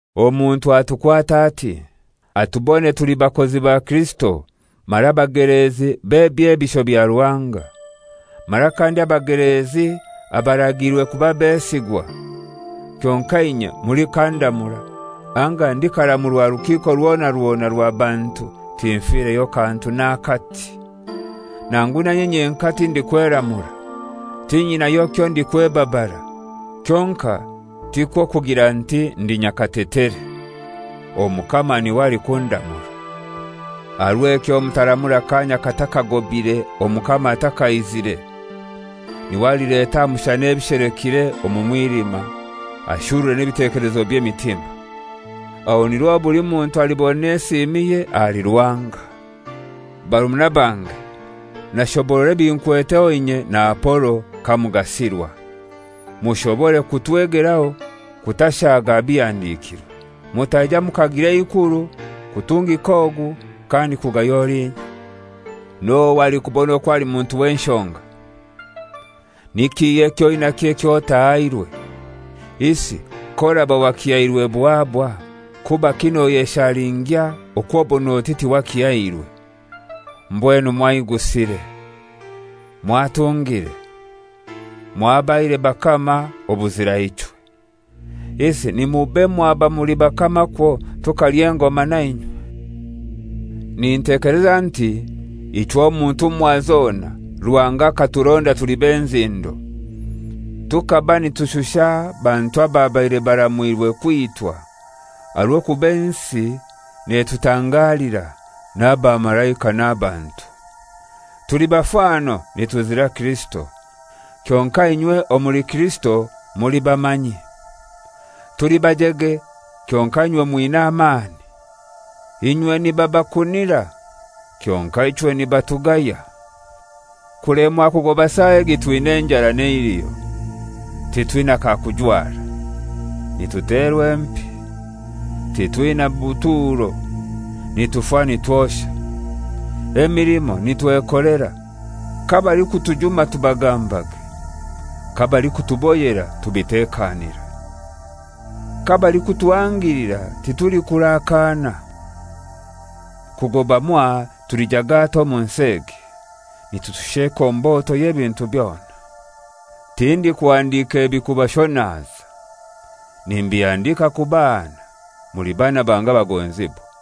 Omuntu atukwate ati: Atubone tuli bakozi ba Kirisito mara bageleezi b'ebyebisho bya Ruhanga. Mara kandi abagelezi abaragiirwe kuba besigwa. Kyonkai inye mulikandamura anga ndikaramurwa rukiiko rwona rwona rwa bantu tinfireyo kantu n'akati. Nangu na inye nyenkai tindikweramura. Tinyinayo kyondikwebabara, kyonkai tikwo kugira nti ndi nyakatetere. Omukama n'iwe alikundamura. Aha rw'ekyo mutaramura kaanya katakagobire, Omukama atakaizire, n'iwe alileta aha mushana ebishelekire omu mwilima ashurure n'ebitekelezo by'emitima: Aho nirwo buli muntu alibona esiimiye ahali Ruhanga. Barumuna bange, nashoborora ebinkweteho inye na Apolo kamugasirwa, mushobore kutwegeraho kutashaaga aha bihandikirwe, mutaija mukagira eikuru kutungika ogu kandi kugaya olinya. N'ohai alikubona okwo ali muntu w'enshonga? Ni kihai eky'oinakyo ekyo otahairwe? Isi k'oraba wakihairwe buhaabwa, kubaki noyeshalingya okw'obon'oti tiwakihairwe? Mbwenu mwaigusire! Mwatungire! Mwabaire bakama obuzira ichwe! Isi nimube mwaba muli bakama kwo tukalya engoma na inywe! Nintekeleza nti ichwe omu ntumwa zona Ruhanga akaturonda tuli b'enzindo, tukaba nitushusha abantu ababaire baramwirwe kwitwa, aha rw'okuba ensi netutangalira, n'abamalaika n'abantu. Tuli bafano nituzira Kirisito, kyonkai inywe omuli Kirisito muli bamanyi. Tuli bajege, kyonkai inywe mwina amani. Inywe nibabakunira, kyonkai ichwe nibatugaya. Kulemwa kugoba saa egi twina enjara n'eiliho, titwina kakujwara, nituterwa empi, titwina buturo, nitufa nitwosha: Emilimo nitwekolera. Kabalikutujuma tubagambage. Kabalikutuboyera tubitekanira. Kabalikutuhangilira titulikurakaana. Kugoba mwaha tuli jagata omu nsi egi, nitushusha ekomboto y'ebintu byona. Tindikuhandika ebi kubashonaza, nimbihandika kubahana, muli baana bange abagonzibwa.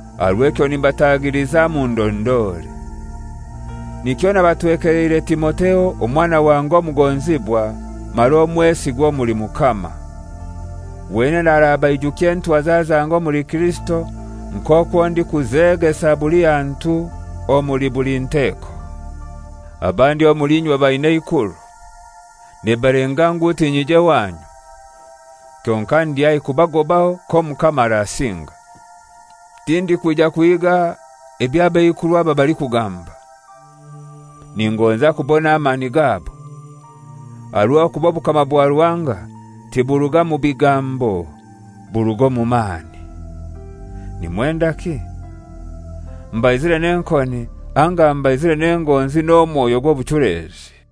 Aha rw'ekyo nimbatagiliza mundondore. Nikyo nabatwekeleire Timotheo, omwana wange omugonzibwa mara omwesigwa omuli Mukama. Wenene arabaijukya entwaza zange omuli Kirisito, nk'okwo ndikuzegesa buli hantu omuli buli nteko. Abandi omuli inywe abaina eikuru, nibalenga ngu tinyije wanyu. Kyonkai ndi haihi kubagobaho k'Omukama arasinga. Tindikwija kuhiiga eby'abeikuru aba balikugamba, ningonza kubona amani gabo. Aha rw'okuba obukama bwa Ruhanga tiburuga mu bigambo, buruga omu mani. Nimwendaki? Mbaizire n'enkoni anga mbaizire n'engonzi n'omwoyo gw'obuchulezi?